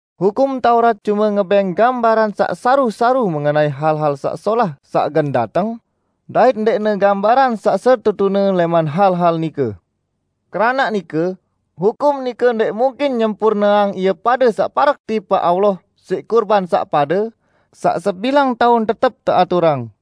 Hukum Taurat cume ngebẽng gambaran saq saru-saru mengenai hal-hal saq solah saq gen dateng, dait ndẽqne gambaran saq setetune lẽman hal-hal nike. Keranaq nike, hukum nike ndẽq mungkin nyempurneang ie pade saq parek tipaq Allah siq kurban saq pade, saq sebilang taun tetep teaturang.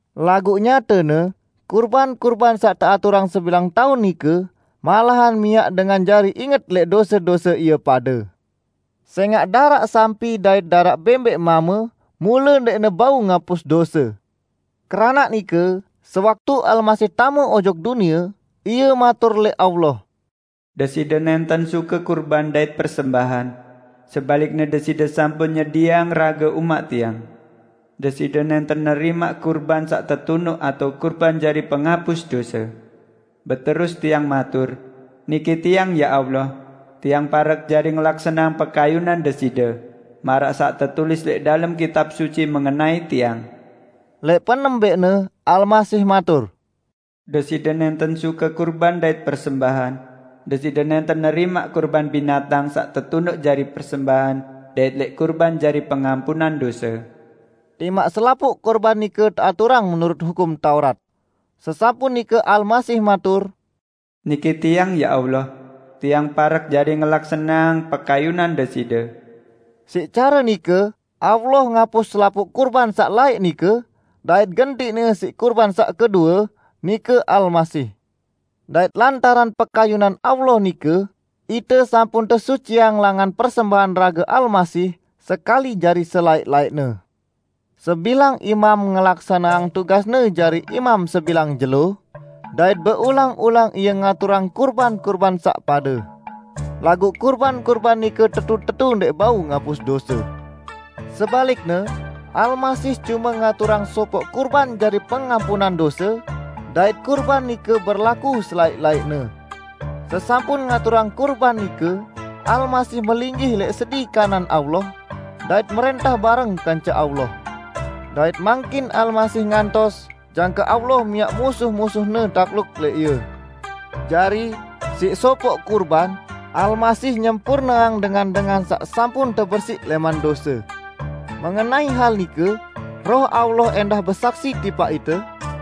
Laguq nyatene kurban-kurban saq teaturang sebilang taun nike malahan miaq dengan jari inget lẽq dose-dose ie pade, sẽngaq daraq sampi dait daraq bẽmbẽq mame mule ndẽqne bau ngapus dose. Keranaq nike sewaktu Almasih tame ojok dunie, Ie matur lẽq Allah, "Deside nẽnten suke kurban dait persembahan; sebalikne Deside sampun nyedieang rage umaq Tiang. Deside nẽnten nerimaq kurban saq tetunuq atao kurban jari pengapus dose. Beterus Tiang matur, 'Niki Tiang, ya Allah! Tiang parek jari ngelaksaneang pekayunan Deside, maraq saq tetulis lẽq dalem Kitab Suci mengenai Tiang!' " Lẽq penembẽqne Almasih matur, "Deside nẽnten suke kurban dait persembahan; Deside nẽnten nerimaq kurban binatang saq tetunuq jari persembahan dait lẽq kurban jari pengampunan dose." Timaq selapuq kurban nike teaturang menurut Hukum Taurat. Sesampun nike Almasih matur, "Niki Tiang, ya Allah! Tiang parek jari ngelaksaneang pekayunan Deside." Siq care nike Allah ngapus selapuq kurban saq laẽq nike, dait gentiqne siq kurban saq kedue, nike Almasih. Dait lantaran pekayunan Allah nike, ite sampun tesuciang langan persembahan rage Almasih, sekali jari selaẽq-laẽqne. Sebilang imam ngelaksaneang tugasne jari imam sebilang jelo, dait beulang-ulang ie ngaturang kurban-kurban saq pade. Laguq kurban-kurban nike tetu-tetu ndẽq bau ngapus dose. Sebalikne, Almasih cume ngaturang sopoq kurban jari pengampunan dose, dait kurban nike berlaku selaẽq-laẽqne. Sesampun ngaturang kurban nike, Almasih melinggih lẽq sedi kanan Allah, dait mrẽntah bareng kance Allah. Dait mangkin Almasih ngantos jangke Allah miaq musuh-musuh-Ne takluk lẽq Ie. Jari siq sopoq kurban, Almasih nyempurneang dengan-dengan saq sampun tepersiq lẽman dose. Mengenai hal nike Roh Allah ẽndah besaksi tipaq ite,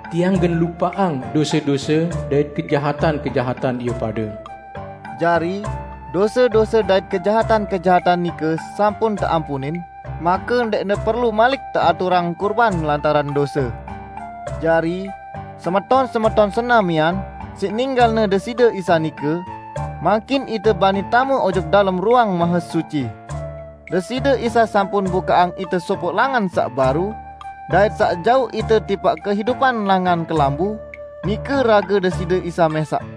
"Tiang gen lupaqang dose-dose dait kejahatan-kejahatan ie pade." Jari, dose-dose dait kejahatan-kejahatan nike sampun teampunin, make ndẽqne perlu malik teaturang kurban lantaran dose. Jari, semeton-semeton senamian, siq ninggalne Deside Isa nike, mangkin ite bani tame ojok dalem Ruang Mahesuci. Deside Isa sampun bukaqang ite sopoq langan saq baru, dait saq jauq ite tipaq kehidupan langan kelambu, nike rage Deside Isa mẽsaq.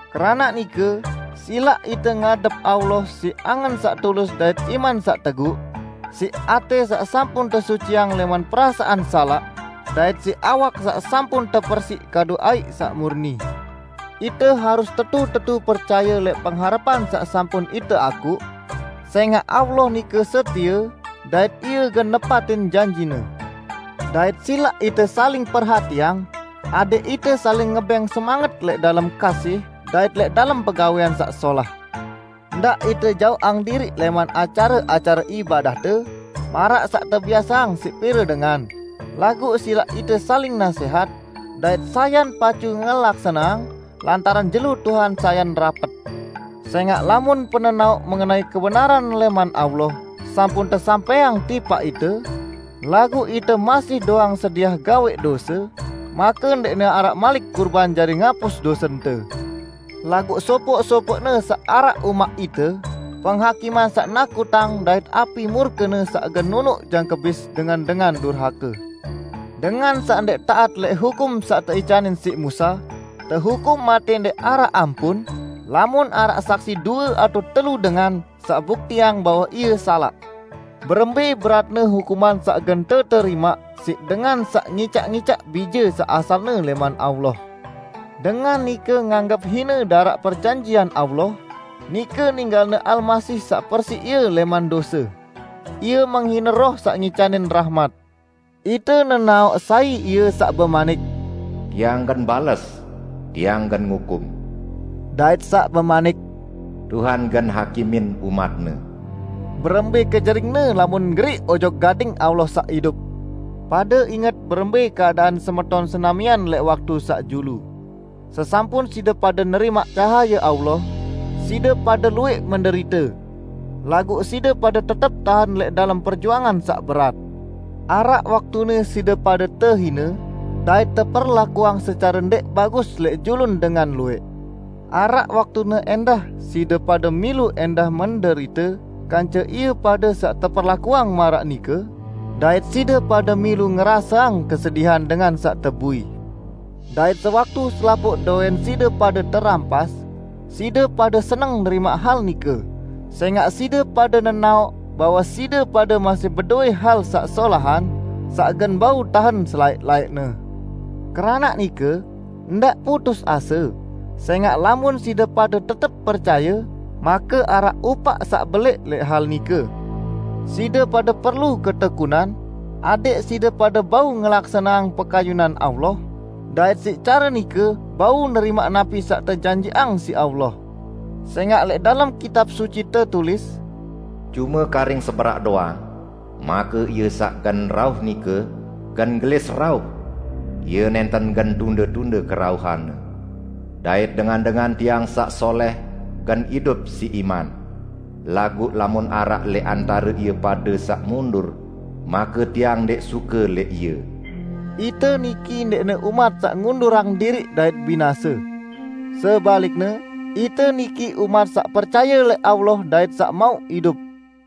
Keranaq nike silaq ite ngadep Allah siq angen saq tulus dait iman saq teguq; siq atẽ saq sampun tesuciang lẽman perasaan salaq, dait siq awak saq sampun tepersiq kadu aiq saq murni. Ite harus tetu-tetu percaye lẽq pengharepan saq sampun ite akuq, sẽngaq Allah nike setie dait Ie gen nepatin janji-Ne. Dait silaq ite saling perhatiang, adẽq ite saling ngebẽng semanget lẽq dalem kasih dait lẽq dalem pegawẽan saq solah. Ndaq ite jaoqang diriq lẽman acare-acare ibadahte, maraq saq tebiaseang siq pire dengan, laguq silaq ite saling nasẽhat, dait sayan pacu ngelaksaneang lantaran jelo Tuhan sayan rapet. Sẽngaq lamun penenaoq mengenai kebenaran lẽman Allah sampun tesampẽang tipaq ite, laguq ite masih doang sediah gawẽq dose, make ndẽqne araq malik kurban jari ngapus dosente. Laguq sopoq-sopoqne saq araq umaq ite, penghakiman saq nakutang dait api murke-Ne saq gen nunuq jangke bis dengan-dengan durhake! Dengan saq ndẽq taat lẽq hukum saq teicanin siq Musa tehukum matẽ ndẽq araq ampun, lamun araq saksi due atao telu dengan, saq buktiang bahwe ie salaq. Berembẽ beratne hukuman saq gen teterimaq siq dengan saq ngicaq-icaq Bije saq asalne lẽman Allah. Dengan nike nganggep hine daraq perjanjian Allah, nike ninggalne Almasih saq persiq ie lẽman dose. Ie menghine Roh saq ngicanin rahmat. Ite nenaoq sai Ie saq bemanik, "Tiang gen bales! Tiang gen ngukum!" dait saq bemanik, "Tuhan gen hakimin umat-Ne." Berembẽ kenjeringne lamun geriq ojok gading Allah Saq Idup! Pade inget berembẽ keadaan semeton senamian lẽq waktu saq julu. Sesampun side pade nerimaq cahaye Allah, side pade luwẽq menderite; laguq side pade tetep tahen lẽq dalem perjuangan saq berat. Araq waktune side pade tehine dait teperlakuang secare ndẽq bagus lẽq julun dengan luwẽq. Araq waktune ẽndah side pade milu ẽndah menderite kance ie pade saq teperlakuang maraq nike, dait side pade milu ngeraseang kesedihan dengan saq tebui. Dait sewaktu selapuq dowẽn side pade terampas, side pade seneng nerimaq hal nike, sẽngaq side pade nenaoq bahwe side pade masih bedowẽ hal saq solahan, saq gen bau tahen selaẽq-laẽqne. Keranaq nike, ndaq putus ase, sẽngaq lamun side pade tetep percaye, make araq upaq saq belẽq lẽq hal nike. Side pade perlu ketekunan, adẽq side pade bau ngelaksaneang pekayunan Allah dait siq care nike bau nerimaq napi saq tejanjiqang siq Allah. Sẽngaq lẽq dalem Kitab Suci tetulis, "Cume karing seberaq doang, make Ie saq gen rauh nike, gen gelis rauh; Ie nẽnten gen tunde-tunde kerauhan-Ne. Dait dengan-dengan Tiang saq solẽh gen idup siq iman; laguq lamun araq lẽq antare ie pade saq mundur, make Tiang ndẽq suke lẽq ie." Ite niki ndẽqne umat saq ngundurang diriq dait binase. Sebalikne, ite niki umat saq percaye lẽq Allah dait saq mauq idup.